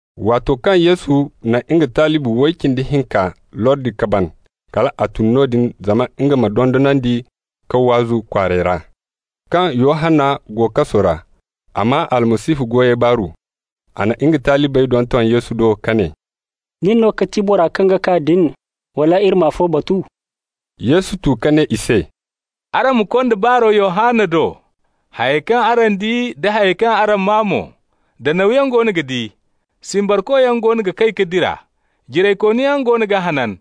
Waato kaŋ Yesu na nga talibi way cindi hinka lordi ka ban, kal a tun noodin zama nga ma dondonandi ka waazu kwaarey ra. Kaŋ Yohanna go kaso ra, a maa Almasihu goyey baaru. A na nga talibey donton Yesu do ka ne: «Nin no ga ti bora kaŋ ga kaa din, wala iri ma afo batu?» Yesu tu ka ne i se: «Araŋ ma konda baaro Yohanna do, hayey kaŋ araŋ di da hayey kaŋ araŋ maa mo: Danawyaŋ goono ga di, simbarkoyaŋ goono ga kay ka dira, jiraykooniyaŋ goono ga hanan,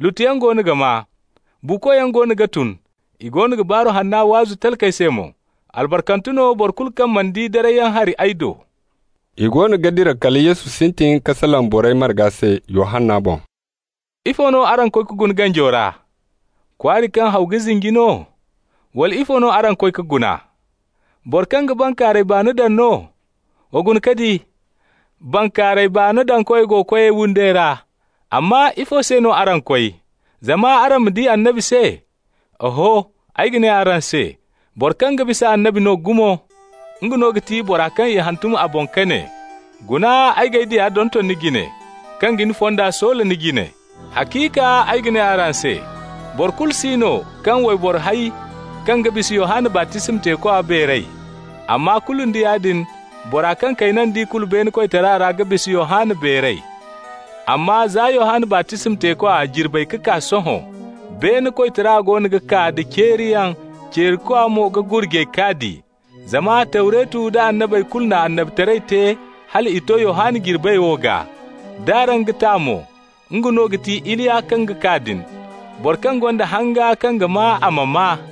lutuyaŋ goono ga maa, buukoyaŋ goono ga tun, i goono ga Baaru Hanna waazu talkey se mo. Albarkante no boro kulu kaŋ mana di darayyaŋ hari ay do.» I goono ga dira kala Yesu sintin ka salaŋ borey marga se Yohanna boŋ: «Ifo no araŋ koy ka guna ganjo ra? Kwaari kaŋ haw ga zinji no? Wala ifo no araŋ koy ka guna? Boro kaŋ ga bankaaray baano daŋ no? Wa guna ka di: bankaaray baano dankoy go koyey windey ra. Amma ifo se no araŋ koy? Zama araŋ ma di annabi se? Oho, ay ga ne araŋ se, boro kaŋ ga bisa annabi no gumo. Nga no ga ti bora kaŋ i hantum a boŋ ka ne: ‹Guna, ay g'ay diya donton ni jine, kaŋ ga ni fonda soola ni jine.› Haciika ay ga ne araŋ se: boro kulu si no kaŋ wayboro hay kaŋ ga bisa Yohanna baptisma teekwa beeray. Amma kulu nda yaadin, bora kaŋ kayna d'i kulu beene koytara ra ga bisa Yohanna beeray. Amma za Yohanna baptisma teekwa jirbey ka kaa sohõ, beene koytara goono ga kaa da ceeriyaŋ, ceerikwa mo ga gurjay k'a di. Zama Tawretu da annabey kulu na annabitaray te hala i to Yohanna jirbey wo gaa. D'araŋ ga ta mo, nga no ga ti Iliya kaŋ ga kaa din. Boro kaŋ gonda hanga kaŋ ga maa, a ma maa!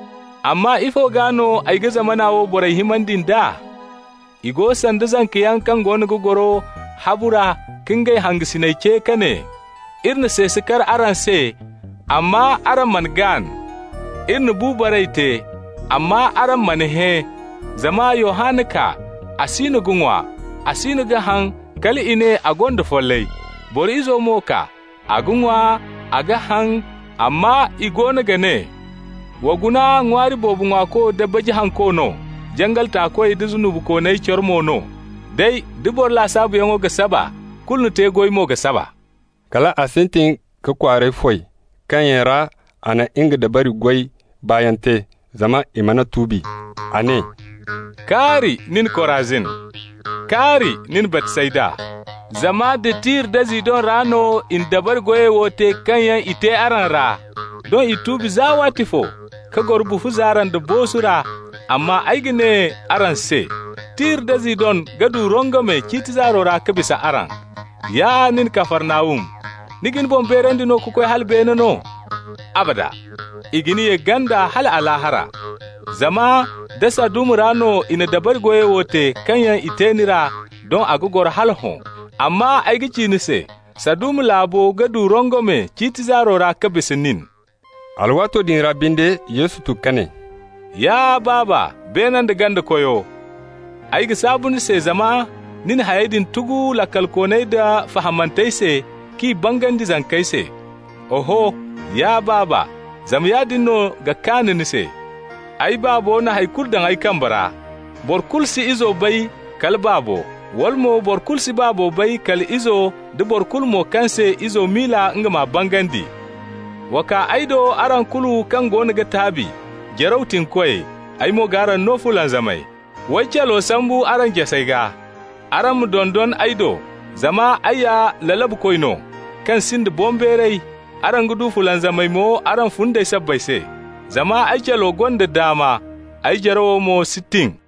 Amma ifo gaa no ay ga zamana wo borey himandi nd'a? I go sanda zankayaŋ kaŋ goono ga goro habu ra ka ngey hangasinyaŋ ce ka ne: ‹Iri na seese kar araŋ se, amma araŋ mana gaan. Iri na bu baray te, amma araŋ mana hẽ.› Zama Yohanna kaa, a siino ga ŋwa, a siino ga haŋ, kal i ne, ‹A gonda follay.› Boro Izo mo kaa, a ga ŋwa, a ga haŋ, amma i goono ga ne: ‹Wa guna ŋwaari boobo ŋwaako da baji hanko no, jangal taakoy da zunubikooney coro mo no!› Day, da boro lasaabuyaŋo ga saba, kulu ni te-goy mo ga saba.» Kal a sintin ka kwaarey foy kaŋ yaŋ ra a na nga dabari goy baayaŋ te, zama i mana tuubi. A ne: «Kaari nin, Korazin! Kaari nin, Baytsayda! Zama nda Tir da Zidon ra no i na dabari goyey wo te kaŋ yaŋ i te araŋ ra, doŋ i tuubi za waatifo ka goro bufu zaara nda boosu ra. Amma ay ga ne araŋ se: Tir da Zidon ga du rongome ciiti zaaro ra ka bisa araŋ. Ya nin Kafarnahum, ni ga ni boŋ beerandi ka koy hala beene no? Abada! I ga ni ye ganda hala Alaahara. Zama nda Saduma ra no i na dabari goyey wo te kaŋ yaŋ i te ni ra, doŋ a ga goro hala hõ. Amma ay ga ci ni se: Saduma laabo ga du rongome ciiti zaaro ra ka bisa nin.» Alwaato din ra binde Yesu tu ka ne: «Ya Baaba, beene nda ganda Koyo, ay ga saabu ni se, zama ni na hayey din tugu laakalkooney da fahamantey se, k'i bangandi zankey se. Oho, ya Baaba, zama yaadin no ga kaan ni se. Ay Baabo na hay kulu daŋ ay kambe ra. Boro kulu si Izo bay kala Baabo, wala mo boro kulu si Baabo bay kala Izo da boro kulu mo kaŋ se Izo miila nga m'a bangandi. Wa kaa ay do, araŋ kulu kaŋ goono ga taabi, jaraw tiŋokoyey, ay mo g'araŋ no fulanzamay. W'ay calo sambu araŋ jasey gaa. Araŋ ma dondon ay do, zama ay ya lalabukoy no, kaŋ sinda boŋbeeray, araŋ ga du fulanzamay mo araŋ fundey sabbay se. Zama ay calo gonda daama, ay jaraw mo si tin.»